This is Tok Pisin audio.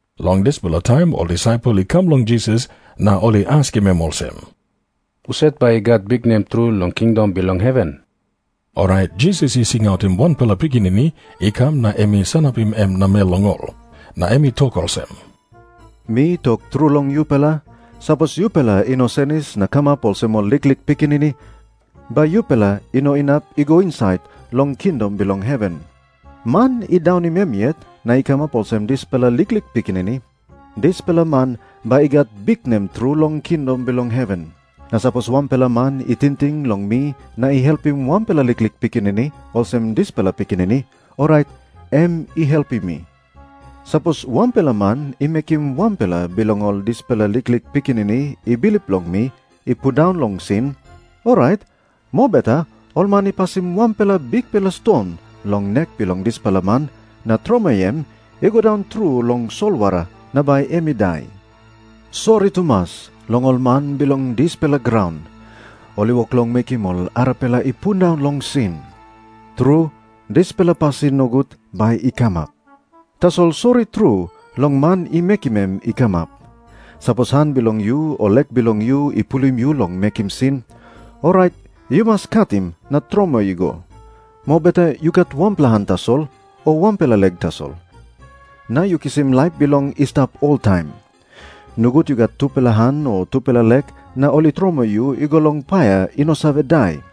Long dispela taim ol disaipel i kam long Jisas na ol i askim em olsem, "Husat bai i gat biknem tru long kingdom bilong heven?" Orait Jisas i singautim wanpela pikinini i kam na em i sanapim em namel long ol. Na em i tok olsem, "Mi tok tru long yupela, sapos yupela i no senis na kamap olsem ol liklik pikinini, bai yupela i no inap i go insait long kingdom bilong heven. Man i daunim em yet na i kamap olsem dispela liklik pikinini, dispela man bai i gat biknem tru long kingdom bilong heven. "Na sapos wanpela man i tingting long mi na i helpim wanpela liklik pikinini olsem dispela pikinini, orait em i helpim mi." Jisas i tok moa olsem, "Sapos wanpela man i mekim wanpela bilong ol dispela liklik pikinini i bilip long mi i pundaun long sin, orait mobeta ol man i pasim wanpela bikpela ston long nek bilong dispela man na tromoi em i go daun tru long solwara na bai em i dai. "Sori tumas long ol man bilong dispela graun, ol i wok long mekim ol arapela i pundaun long sin. Tru, dispela pasin nogut bai i kamap. Tasol sori tru long man i mekim em i kamap. Sapos han bilong yu o lek bilong yu i pulim yu long mekim sin, orait yu mas katim na tromoi i go. Mobeta yu gat wanpela han tasol, o wanpela lek tasol, na yu kisim laip bilong i stap oltaim. Nogut yu gat tupela han o tupela lek na ol i tromoi yu i go long paia i no save dai.